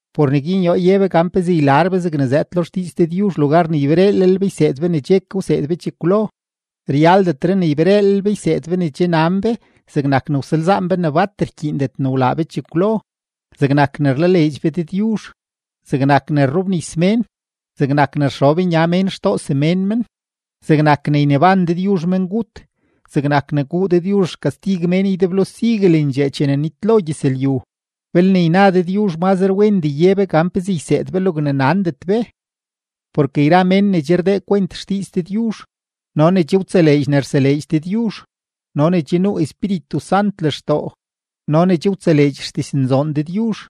Por neguin yoo ye be gan pezee ylar be zegne zëëd lo xdiiz Dëdyuzh lugar ne ybereelel be yseed be ne che ke wseed be chekwlo. Ryaldetre ne ybereelel be yseed be ne che nan be zegnak ne ysalzaan be ne bat rkyiindet ne wlaa be chekwlo, zegnak ne rlaleedx be Dëdyuzh, zegnak ne rrobnis mén, zegnak ne rxob nya mén xtoo semén men, zegnak ne yneban Dëdyuzh mengut, zegnak ne guu Dëdyuzh xkastig mén ydeblo siguelendxee chene nitlo gyëzlyu. Belne yna Dëdyuzh, mazre wendee ye be gan pezee yseed be logne nandet be. Porke yra mén ne che rdee kwent xdiiz Dëdyuzh no ne che wtseleedx ne rseleedx Dëdyuzh no ne che nuu Espíritu Sant lextoo no ne che wtseleedx xdiznzoon Dëdyuzh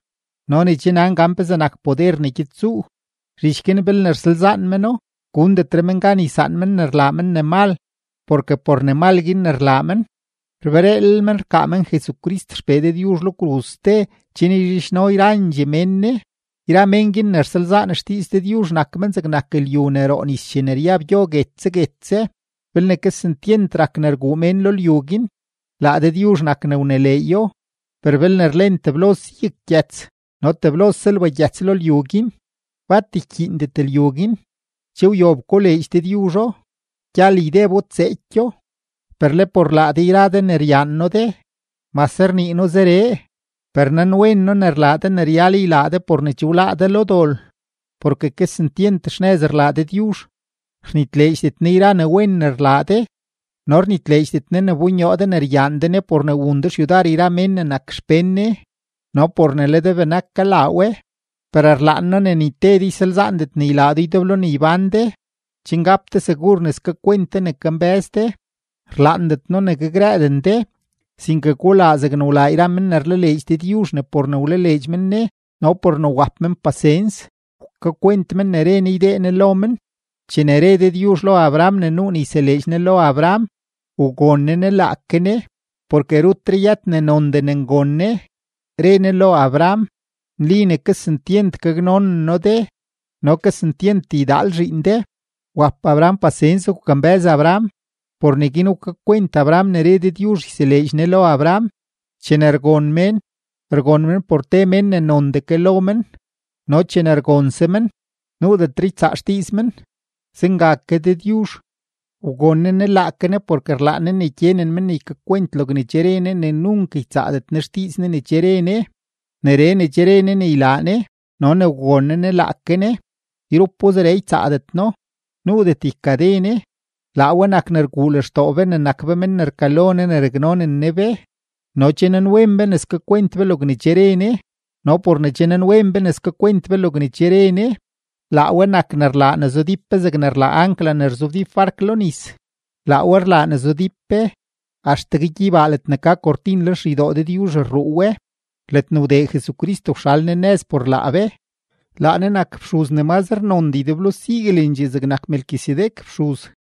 no ne che nan gan pezee nak poder ne gyed tsuu, zhich guin belne rsalzaan meno, gundetre men gan ysaan men ne rlaa men ne mal porke por ne mal guin ne rlaa men, rbereelel men rkaa men Jesucrist XPee Dëdyuzh lo kruz ste chen yzhidxno yrandxee mén Ne. Yra men guin ne rsalzaan xdiiz Dëdyuzh nak men zegnak lyu ne roo nis chene ryab gyo guetse guetse; belne kesentyent rak ne rguu mén lo lyu guin, laa Dëdyuzh nak ne wneleeyo, per belne rlen teblose yaggyëts no teblose lbagyëts lo lyu guin, bat ykyiindet lyu guin, che wyob koleedx Dëdyuzho, gyal ydebo tseekyo. Per le por laa de yra de ne ryaan noo de, mase rnii noo zeree, per nanwen noo ne rlaa de ne ryal ylaa de por ne che wláá de lo dol. Porke kesentyent xnëz rlaa Dëdyuzh, rnitleedxdet Ne yra ne wen ne rlaa de no rnitleedxdet Ne ne wbonyoo de ne ryaan de Ne por ne wun de xyudar yra men ne nak xpén Ne no por ne le de benak kalaa we. Per rlaan noo ne ni te de ysalzaandet ne ylaa do ydeblo ne ybán de, chen gap de segur ne skakwent de ne kambë́z de. Rlaandet noo ne gakrëëden de, sinke gulaa zegne wlaa yra men ne rlaleedx Dëdyuzh ne por ne wlaleedx men Ne no por ne wap men pasens, wkakwent men ne re Ne ydee Ne lo men. Chene re Dëdyuzh lo Abraham ne nuu ne yseleedx Ne lo Abraham, wgon Ne Ne laake Ne, porke rutre yët ne nondee ne ngon Ne, re Ne lo Abraham: “Nli ne kesentyent gaknonen noo de no kesentyent ydaal zhiin de.” Wap Abraham pasens wkambë́z Abraham, por neguin wkakwent Abraham ne re Dëdyuzh yseleedx Ne lo Abraham. Chene rgon mén, rgon men por te mén ne nondee ke lo men; no chene rgonse men, nuudetre ne ytsaa xdiiz men. Zenga ke Dëdyuzh, wgon Ne Ne laake Ne porke rlaan Ne ne gyenen men ne ykakwent logne che re Ne ne nunk ytsaadet Ne xdiiz Ne ne che re Ne. Neree ne che re Ne ne ylaa Ne no ne wgon Ne Ne laake Ne, yrupo zeree ytsaadet No, nuudet ykade Ne. Laa we nak ne rguu lextoo be ne nak be men ne rkalo Ne ne raknonen Ne be no che nanwen be ne skakwent be logne che re Ne. No por ne che nanwen be ne skakwent be logne che re Ne, laa we nak ne rlaa ne zudíp be zegne rlaa ancla ne rzobdíp bark lo nis; laa we rlaa ne zudíp be, axtegue gyeybaa ledne ka kortin lenxeydoo Dëdyuzh rruu we, ledne wdee Jesucrist wxal Ne nëz por laa be. Laa Ne nak fxuz ne mazre nondee ydeblo siguelendxee zegnak Melquisedec fxuz.